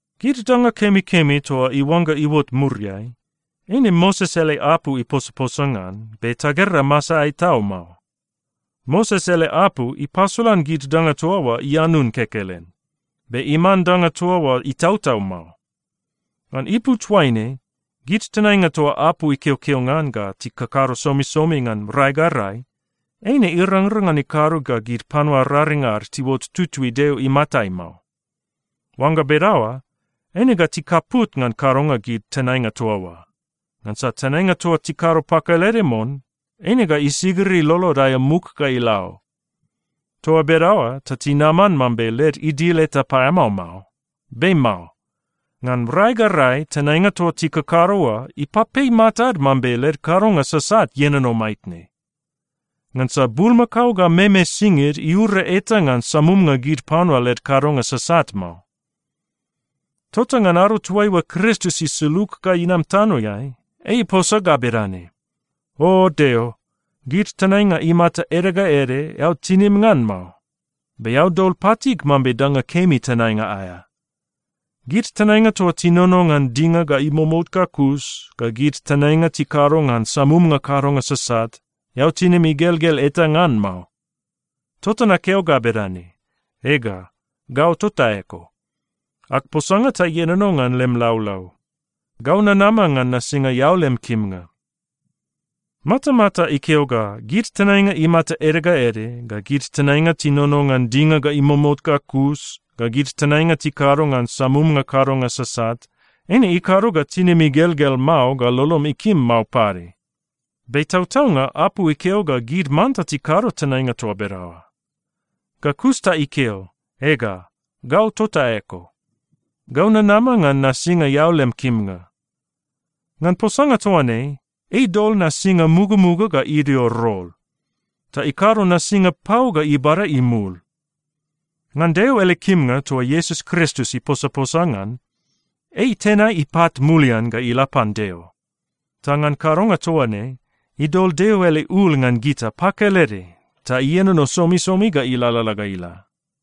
Gid danga kemikemi toa iuangga iuot muriai, eine Moses ele apu iposaposa ngan, be tagera masaeai tau mao. Moses ele apu ipasolan gid danga toa oa ianun kekelen. Be iman danga toa oa itautau mao. Ngan ipu toaine, gid tenainga toa apu ikeokeo ngan ga tikakado somisomi ngan rai ga rai, eine irangrang ngan ikado ga gid panua raring ad tiuot tutui Deo imatai mao. Oangga bedaoa, eine ga tikaput ngan kadonga gid tenainga toa oa, ngansa tenainga toa tikado pakelede mon, eine ga isigiri lolod aea muk ga ila o. Toa bedaoa ta tinaman mambe led idil eta paeamao mao. Be mao. Ngan rai ga rai, tenainga toa tikakado oa ipapei matad mambe led kadonga sasat ienono maitne. Ngansa bulmakao ga meme singid iura eta ngan samumnga gid panua led kadonga sasat mao. Tota ngan ado toaiua Kristus isulug ga inam tanoeai, ei iposa ga bedane, “O Deo, gid tenainga imata ede ga ede, eao tinim ngan mao. Be eao dol patig mambe danga kemi tenainga aea. Gid tenainga toa tinono ngan dinga ga imomout ga kus, ga gid tenainga tikado ngan samumnga kadonga sasat, eao tinim igelgel eta ngan mao. Tota nakeo ga bedane, ‘Ega, gau tota eko. Ag posanga ta ienono ngan lem laulau. Gau nanama ngan nasinga eao lem kimnga.’” Matamata ikeo ga, “Gid tenainga imata ede ga ede, ga gid tenainga tinono ngan dinga ga imomout ga kus, ga gid tenainga tikado ngan samumnga kadonga sasat, eine ikado ga tinim igelgel mao ga lolom ikim mao pade.” Be tautaunga apu ikeo ga gid manta tikado tenainga toa bedaoa. Ga kus ta ikeo, “Ega, gau tota eko. Gau nanama ngan nasinga eao lem kimnga.” Ngan posanga toa ne, ei dol nasinga mugamuga ga idio rol, ta ikado nasinga pau ga ibada imul. Ngan Deo ele kimnga toa Iesus Kristus iposaposa ngan, ei itenai ipat mulian ga ila pan Deo. Ta ngan kadonga toa ne, idol Deo ele ul ngan gita pakelede ta ienono somisomi ga ilalala ga ila.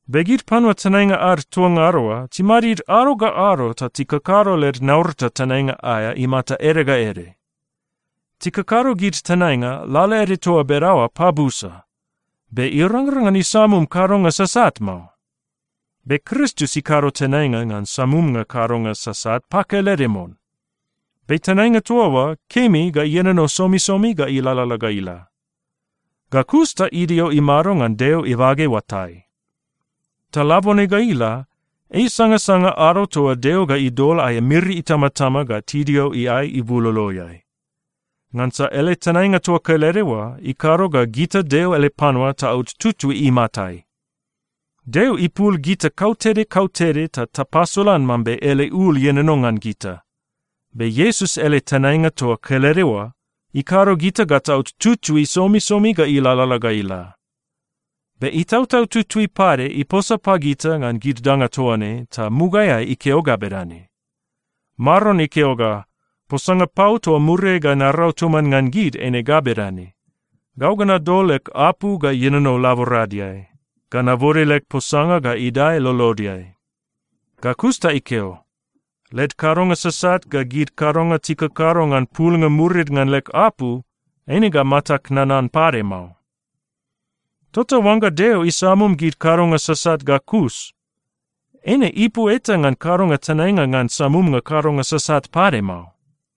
Be gid panua tenainga ad toa ngada oa timadid ado ga ado ta tikakado led naurata tenainga aea imata ede ga ede. Tikakado gid tenainga lalaede toa bedaoa pabusa, be irangrang ngan isamum kadonga sasat mao. Be Kristus ikado tenainga ngan samumnga kadonga sasat pakelede mon. Be tenainga toa oa kemi ga ienono somisomi ga ilalala ga ila. Ga kus ta idio imado ngan Deo ibage oatai. Ta labone ga ila, ei isangasanga ado toa Deo ga idol aea miri itamatama ga tidio iae ibuloloeai. Ngansa ele tenainga toa kelede oa ikado ga gita Deo ele panua taot tutui imatai. Deo ipul gita kautede kautede ta tapasolan mambe ele ul ienono ngan gita, be Iesus ele tenainga toa kelede oa ikado gita ga taot tutui somisomi ga ilalala ga ila. Be Itautau Tutui pade iposa pagita ngan gid danga toa ne ta mugaeai ikeo ga bedane, “Maron ikeo ga, ‘Posanga pau toa muriai ga narau toman ngan gid eine ga bedane: Gau ga nadol leg apu ga ienono laboradeai. Ga nabode leg posanga ga idae lolodeai.’” Ga kus ta ikeo, “Led kadonga sasat ga gid kadonga tikakado ngan pulnga murid ngan leg apu, eine ga matag nanan pade mao.” Tota oangga Deo isamum gid kadonga sasat ga kus, eine ipu eta ngan kadonga tenainga ngan samumnga kadonga sasat pade mao.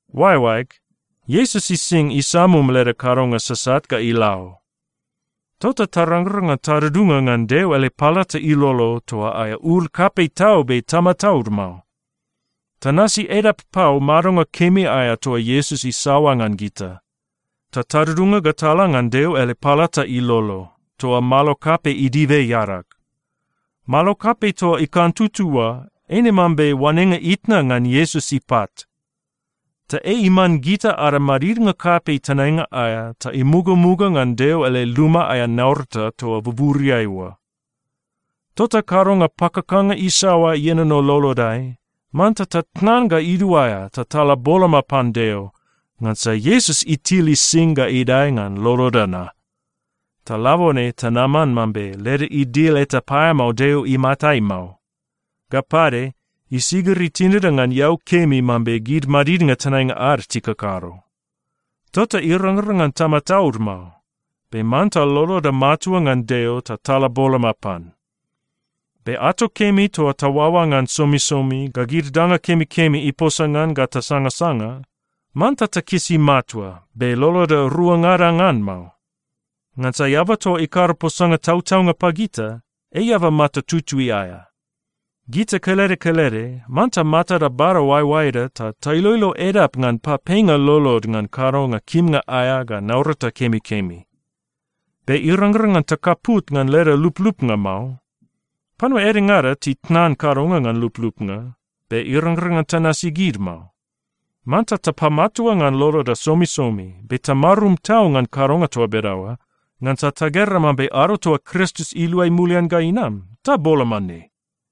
Oaeoaeg, Iesus ising isamum leda kadonga sasat ga ila o. Tota tarangrang ngan tadudunga ngan Deo ele palata ilolo toa aea ul kapei tau be tamataud mao. Tanasi edap pau madonga kemi aea toa Iesus isaoa ngan gita. Ta tadudunga ga tala ngan Deo ele palata ilolo, toa malo kapei idibe iadag. Malo kapei toa ikantutu oa eine mambe oanenga itna ngan Iesus ipat. Ta ei iman gita ada madidnga kapei tenainga aea ta imugamuga ngan Deo ele luma aea naurata toa buburiai oa. Tota kadonga pakakanga isaoa ienono lolodai, manta tatnan ga iduaea ta tala boloma pan Deo, ngansa Iesus itil ising ga idae ngan loloda na. Ta labone tanaman mambe leda idil eta paeamao Deo imatai mao. Ga pade, isigiri tinida ngan eau kemi mambe gid madidnga tenainga ad tikakado. Tota irangrang ngan tamataud mao, be manta loloda matua ngan Deo ta tala boloma pan. Be ato kemi toa taoaoa ngan somisomi ga gid danga kemikemi iposa ngan ga tasangasanga, manta takisi matua, be loloda ruangada ngan mao. Ngansa eaba toa ikado posanga tautaunga pagita, ei eaba mata tutui aea. Gita kelede kelede manta matada bada oaeoaeda ta tailoilo edap ngan papeinga lolod ngan kadonga kimnga aea ga naurata kemikemi. Be irangrang ngan takaput ngan leda luplupnga mao. Panua edengada titnan kadonga ngan luplupnga, be irangrang ngan tanasi gid mao. Manta tapamatua ngan loloda somisomi, be tamarum tau ngan kadonga toa bedaoa, ngansa tagera mambe ado toa Kristus iluai mulian ga inam, ta boloma ne.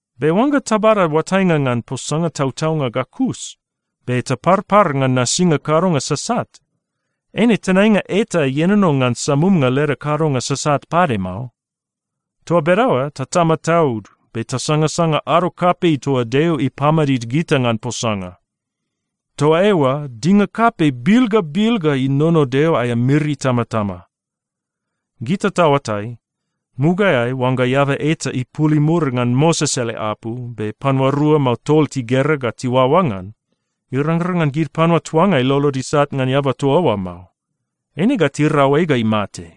Be oangga tabada oatainga ngan posanga tautaunga ga kus, be taparpar ngan nasinga kadonga sasat, eine tenainga eta ienono ngan samumnga leda kadonga sasat pade mao. Toa bedaoa ta tamataud be tasangasanga ado kapei toa Deo ipamadid gita ngan posanga. Toa eoa dinga kapei bil ga bil ga inono Deo aea miri itamatama. Gita taoatai, mugaeai oangga eaba eta ipul imur ngan Moses ele apu be panua rua mao tol tigera ga tiuaoa ngan, irangrang ngan gid panua tuangai lolod isat ngan eaba toa oa mao. Eine ga tirau ei ga imate.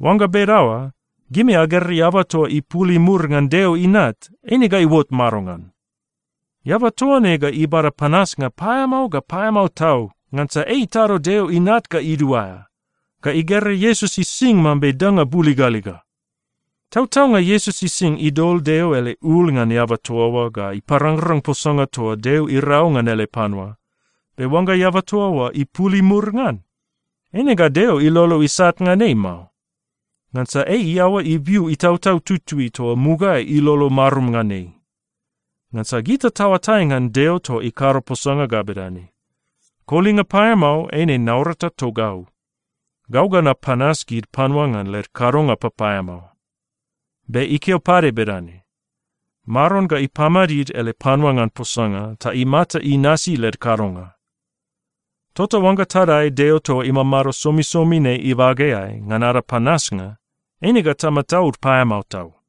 Oangga bedaoa, gimi agera eaba toa ipul imur ngan Deo Inat, eine ga iuot madongan? Eaba toa ne ga ibada panasnga paeamao ga paeamao tau, ngansa ei itado Deo Inat ga iduaea. Ga igera Iesus ising mambe danga buligaliga. Tautaunga, Iesus ising idol Deo ele ul ngan eaba toa oa ga iparangrang posanga toa Deo irau ngan ele panua, be oangga eaba toa oa ipul imur ngan, eine ga Deo ilolo isat ngan ei mao. Ngansa ei iaoa ibiu Itautau Tutui toa mugaeai ilolo marum ngan ei. Ngansa gita taoatai ngan Deo toa ikado posanga ga bedane, “Kolinga paeamao eine naurata togau. Gau ga napanas gid panua ngan led kadonga papaeamao.” Be ikeo pade bedane, “Maron ga ipamadid ele panua ngan posanga ta imata inasi led kadonga.” Tota oangga tadae Deo toa imamado somisomi ne ibageai ngan ada panasnga, eine ga tamataud paeamao tau.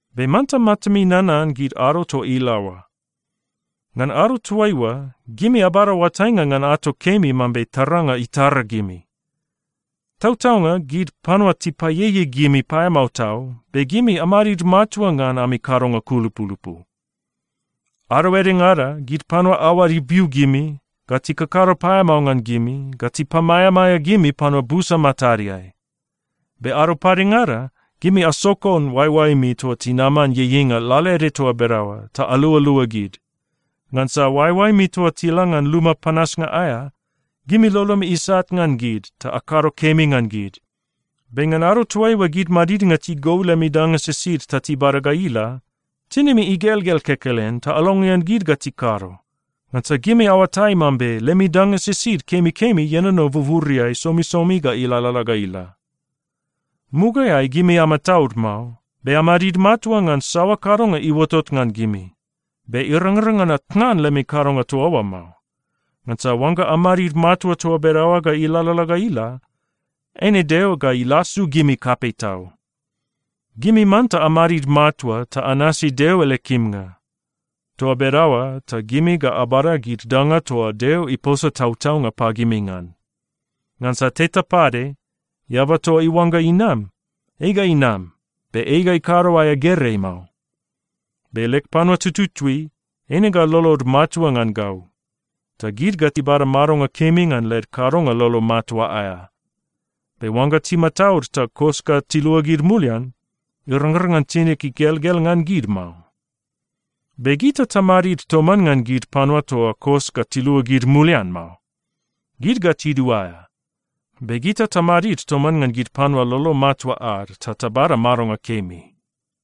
Be manta matami nanan gid ado toa ila oa. Ngan ado toaiua, gimi abada oatainga ngan ato kemi mambe taranga itara gimi. Tautaunga, gid panua tipaieiei gimi paeamao tau, be gimi amadid matua ngan ami kadonga kulupulupu. Ado edengada gid panua aoad ibiu gimi, ga tikakado paeamao ngan gimi, ga tipamaeamaea gimi panua busa matadeai. Be ado padengada gimi asokon oaeoaemi toa tinaman ieieinga lalaede toa bedaoa ta alualua gid. Ngansa oaeoaemi toa tila ngan luma panasnga aea, gimi lolomi isat ngan gid ta akado kemi ngan gid. Be ngan ado toaiua gid madidnga tigou lemi danga sisid ta tibada ga ila, tinimi igelgel kekelen ta alongean gid ga tikado, ngansa gimi aoatai mambe lemi danga sisid kemikemi ienono buburiai somisomi ga ilalala ga ila. Mugaeai gimi amataud mao, be amadid matua ngan saoa kadonga iuotot ngan gimi. Be irangrang ngan atnan lemi kadonga toa oa mao. Ngansa oangga amadid matua toa bedaoa ga ilalala ga ila, eine Deo ga ilasu gimi kapei tau. Gimi manta amadid matua ta anasi Deo ele kimnga. Toa bedaoa ta gimi ga abada gid danga toa Deo iposa tautaunga pagimi ngan. Ngansa teta pade, “Eaba toa iuangga inam, ei ga inam, be ei ga ikado aea gerei mao. Be leg panua tututui, eine ga lolod matua ngan gau. Ta gid ga tibada madonga kemi ngan led kadonga lolo matua aea. Be oangga timataud ta kos ga tiluagid mulian, irangrang ngan tinig igelgel ngan gid mao.” Be gita tamadid toman ngan gid panua toa kos ga tiluagid mulian mao. Gid ga tiduaea. Be gita tamadid toman ngan gid panua lolo matua ad ta tabada madonga kemi.